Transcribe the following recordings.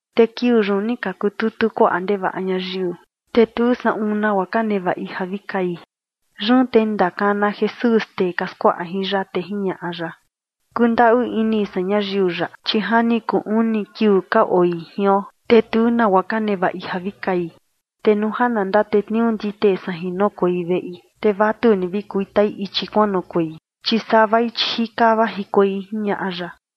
Te kiuu yun ni ka kututu kuaꞌa ndevaꞌa ñayiu, te tu saꞌun nagua ka nevaꞌi ja vi kai. Yun te ni ndakana Jesús tee ka skuaꞌa jin ya, te jiñaꞌa ya: ―Kundaꞌu ini san ñayiu yaꞌa, chi ja ni kuu uni kiuu ka oi jion, te tu nagua ka nevaꞌi ja vi kai. Te nuu ja na ndatetniuu ndite san jin ja noꞌokuei veꞌi, te vatuni vi kuitai ichi kuanoꞌokuei, chi savai, chi jika vajikuei ―jiñaꞌa ya.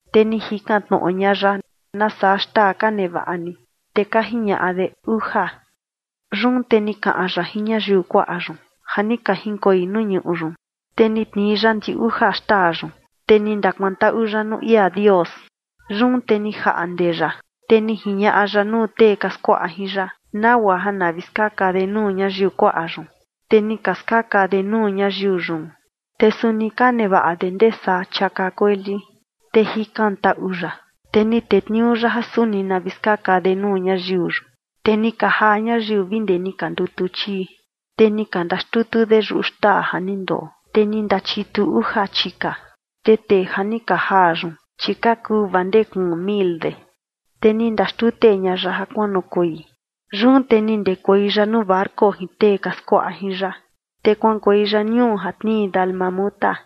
Te ni jikan tnoꞌo ña ya: ―¿Nasaa xtaa ka nevaꞌa ni? Te ka jiñaꞌa de: ―Uja. Yun te ni kaꞌan ya jin ñayiu kuaꞌa yun ja ni ka jinkoi nuu ñuꞌu yun, te ni tnii ya ndi uja xtaa yun, te ni ndakuantaꞌu ya nuu ia Dios. Yun te ni jaꞌnde ya, te ni jiñaꞌa ya nuu tee ka skuaꞌa jin ya, nagua ja na vi skaka de nuu ñayiu kuaꞌa yun. Te ni ka skaka de nuu ñayiu yun. Te suni ka nevaꞌa de ndee saa chiaka kueli. Te jikantaꞌu ya, te ni tetniuu ya ja suni na vi skaka de nuu ñayiu yun. Te ni ka jaa ñayiu vi ndee ni ka ndutu chii. Te ni ka ndaxtutu de yuꞌu xtaa ja ni ndoo, te ni ndachitu uja chika. Te tee ja ni ka jaa yun, chi ka kuu vaa ndee kuun mil de. Te ni ndaxtute ña ya ja kuanoꞌokuei. Yun te ni ndekuei ya nuu barco jin tee ka skuaꞌa jin ya, te kuaꞌankuei ya ñuu ja tnii Dalmanuta.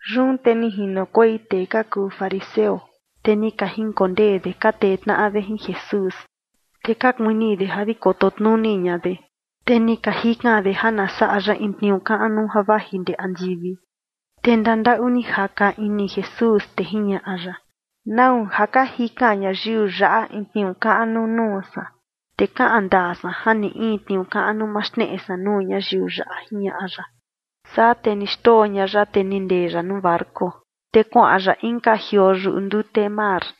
Yun te ni jinokuei tee ka kuu fariseo, te ni ka jinkondee de ka tee tnaꞌa de jin Jesús. Te ka kuini de ja vi koto tnuni ña de. Te ni ka jikan de ja na saꞌa ya in tniuu kaꞌnu ja vaji ndee andivi. Te ndandaꞌu ni jaka ini Jesús, te jiñaꞌa ya: ―¿Nau ja ka jikan ñayiu yaꞌa in tniuu kaꞌnu nuu san? Te kaꞌan ndaa san ja ni in tniuu kaꞌnu ma xneꞌe san nuu ñayiu yaꞌa ―jiñaꞌa ya. Saa te ni xndoo ña ya, te ni ndee ya nuu barco, te kuaꞌan ya inka jioo yuꞌu ndute mar.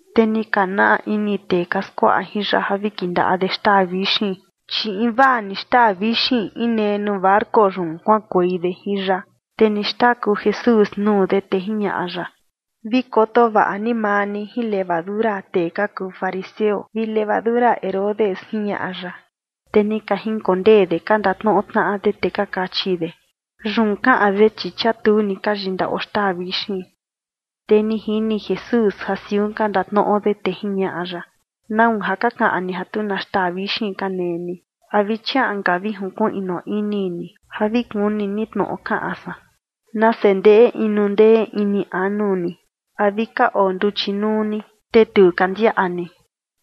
Te ni ka naa ini tee ka skuaꞌa jin ya ja vi kindaꞌa de xtaa vixin, chi invaa ni xtaa vixin inee nuu barco yun kuaꞌankuei de jin ya. Te ni xtaku Jesús nuu de, te jiñaꞌa ya: ―Vi koto vaꞌa ni maa ni jin levadura tee ka kuu fariseo vi levadura Herodes ―jiñaꞌa ya. Te ni ka jinkondee de ka ndatnoꞌo tnaꞌa de, te ka kachi de: ―Yun kaꞌan de, chi chia tu ni ka yindaꞌo xtaa vixin. Te ni jini Jesús ja siun ka ndatnoꞌo de, te jiñaꞌa ya: ―¿Nau ja ka kaꞌan ni ja tu na xtaa vixin ka nee ni? ¿A vi chiaꞌan ka vi jinkuiꞌnu ini ni ja vi kuni ni tnoꞌo kaꞌan san? ¡Nase ndeꞌe inu ndee ini anu ni! ¿A vi ka oo nduchi nuu ni, te tu ka ndiaꞌa ni?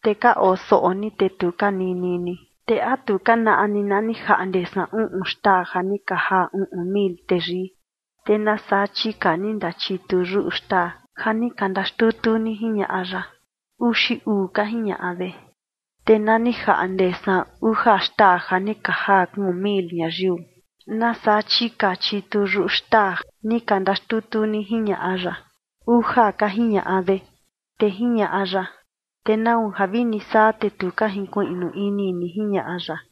Te ka oo soꞌo ni, te tu ka nini ni. Te ¿a tu ka naꞌa ni na ni jaꞌnde san uꞌun xtaa ja ni ka jaa uꞌun mil teyii? Te ¿nasaa chika ni ka ndachitu yuꞌu xtaa ja ni ka ndaxtutu ni? ―jiñaꞌa ya. ―Uxi uu ―ka jiñaꞌa de. ―Te na ni jaꞌnde san uja xtaa ja ni ka jaa kuun mil ñayiu, ¿nasaa chika chitu yuꞌu xtaa ni ka ndaxtutu ni? ―jiñaꞌa ya. ―Uja ―ka jiñaꞌa de. Te jiñaꞌa ya: ―Te ¿nau ja vini saa, te tu ka jinkuiꞌnu ini ni? ―jiñaꞌa ya.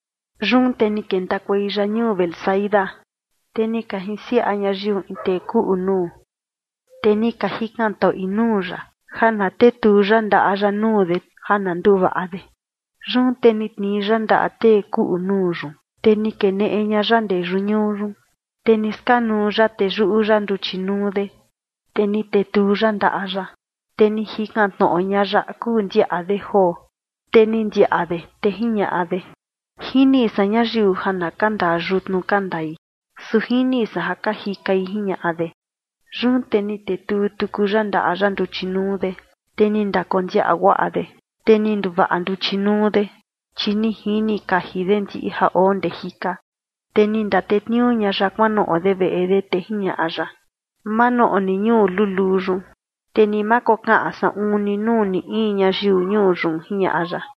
Yun te ni kentakuei ya ñuu Betsaida. Te ni ka jinsiaꞌa ñayiu in tee kuꞌu nuu, te ni ka jikantaꞌui nuu ya ja na tetuu ya ndaꞌa ya nuu de ja na nduvaꞌa de. Yun te ni tnii ya ndaꞌa tee kuꞌu nuu yun, te ni keneꞌe ña ya ndee yuꞌu ñuu yun. Te ni skanuu ya teyuꞌu ya nduchi nuu de, te ni tetuu ya ndaꞌa ya. Te ni jikan tnoꞌo ña ya a kuu ndiaꞌa de joo. Te ni ndiaꞌa de, te jiñaꞌa de: ―Jini san ñayiu ja na ka ndaa yutnu ka ndai, su jini san ja ka jikai ―jiñaꞌa de. Yun te ni tetuu tuku ya ndaꞌa ya nduchi nuu de, te ni ndakondiaꞌa guaꞌa de, te ni nduvaꞌa nduchi nuu de, chi ni jini kaji de ndiꞌi ja oo ndee jika. Te ni ndatetniuu ña ya kuanoꞌo de veꞌe de, te jiñaꞌa ya: ―Ma noꞌo ni ñuu luluu yun, te ni ma kokaꞌan saꞌun ni nuu ni in ñayiu ñuu yun ―jiñaꞌa ya.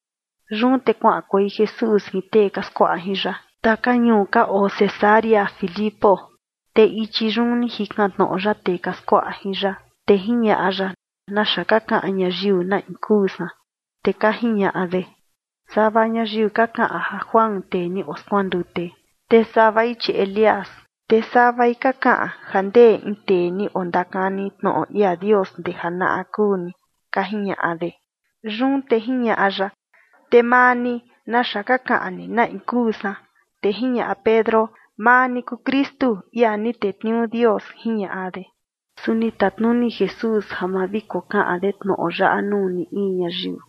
Yun te kuaꞌankuei Jesús jin tee ka skuaꞌa jin ya taka ñuu ka oo Cesarea Filipo. Te ichi yun ni jikan tnoꞌo ya tee ka skuaꞌa jin ya, te jiñaꞌa ya: ―¿Naxa ka kaꞌan ñayiu na in kuu san? Te ka jiñaꞌa de: ―Sava ñayiu ka kaꞌan ja Juan tee ni oskuandute, te savai chi Elías, te savai ka kaꞌan ja ndee in tee ni ondakani tnoꞌo ia Dios ndee janaꞌa kuu ni ―ka jiñaꞌa de. Yun te jiñaꞌa ya: ―Te maa ni, ¿naxa ka kaꞌan ni na in kuu san? Te jiñaꞌa Pedro: ―Maa ni kuu Kristu, ia ni tetniuu Dios ―jiñaꞌa de. Su ni tatnuni Jesús ja ma vi kokaꞌan de tnoꞌo yaꞌa nuu ni in ñayiu.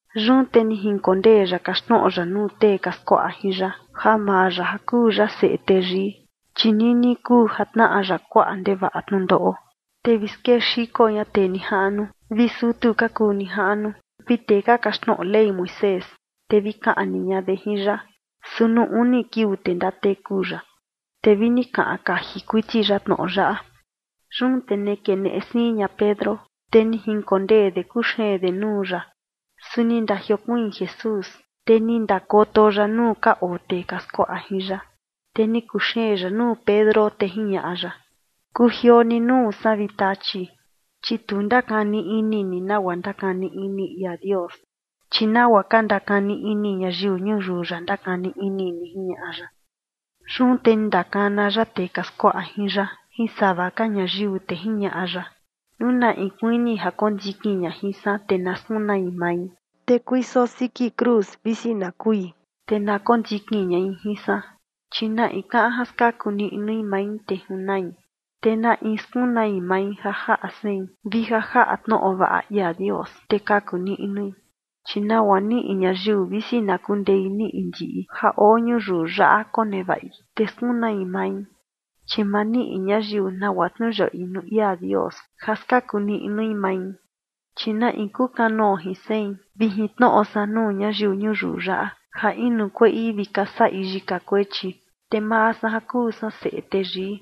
Yun te jinkondee ya kaxtnoꞌo ya nuu tee ka skuaꞌa jin ya ja maa ya ja kuu ya Seꞌe Teyii, chi nini kuu ja tnaꞌa ya kuaꞌa ndevaꞌa tnundoꞌo. Te vi skexiko ña tee nijaꞌnu vi sutu ka kuu nijaꞌnu vi tee ka kaxtnoꞌo Ley Moisés, te vi kaꞌni ña de jin ya, su nuu uni kiuu te ndateku ya. Te vi ni kaꞌan kaji kuiti ya tnoꞌo yaꞌa. Yun te ni keneꞌe siin ña Pedro, te ni jinkondee de kuxeen de nuu ya. Su ni ndajiokuiin Jesús, te ni ndakoto ya nuu ka oo tee ka skuaꞌa jin ya, te ni kuxeen ya nuu Pedro, te jiñaꞌa ya: ―Kujioo ni nuu san, vi Tachi, chi tu ndakani ini ni nagua ndakani ini ia Dios, chi nagua ka ndakani ini ñayiu ñuyiu yaꞌa ndakani ini ni ―jiñaꞌa ya. Yun te ni ndakana ya tee ka skuaꞌa jin ya jin sava ka ñayiu, te jiñaꞌa ya: ―Nuu na in kuini ja kondikin ña jin san, te na skunai mai, te kuiso siki cruz visi na kui, te na kondikin ñai jin san. Chi na in kaꞌan ja skaku niꞌnui mai, te junai. Te na in skunai mai ja jaꞌa sein vi ja jaꞌa tnoꞌo vaꞌa ia Dios, te kaku niꞌnui. Chi ¿nagua niꞌi ñayiu visi na kundei niꞌi ndiꞌi ja oo ñuyiu yaꞌa konevaꞌi, te skunai mai? Chi ma niꞌi ñayiu nagua tniuyaꞌui nuu ia Dios ja skaku niꞌnui mai. Chi na in kukanoo jin sein vi jin tnoꞌo san nuu ñayiu ñuyiu yaꞌa ja inu kueꞌi vi ka saꞌi yika kuechi, te maa san ja kuu san Seꞌe Teyii,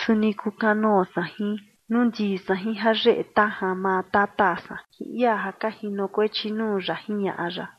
suni kukanoo san jin, nuu ndii san jin jayeꞌe tajan maa tata san jin ia ja ka jinokuechi nuu ya ―jiñaꞌa ya.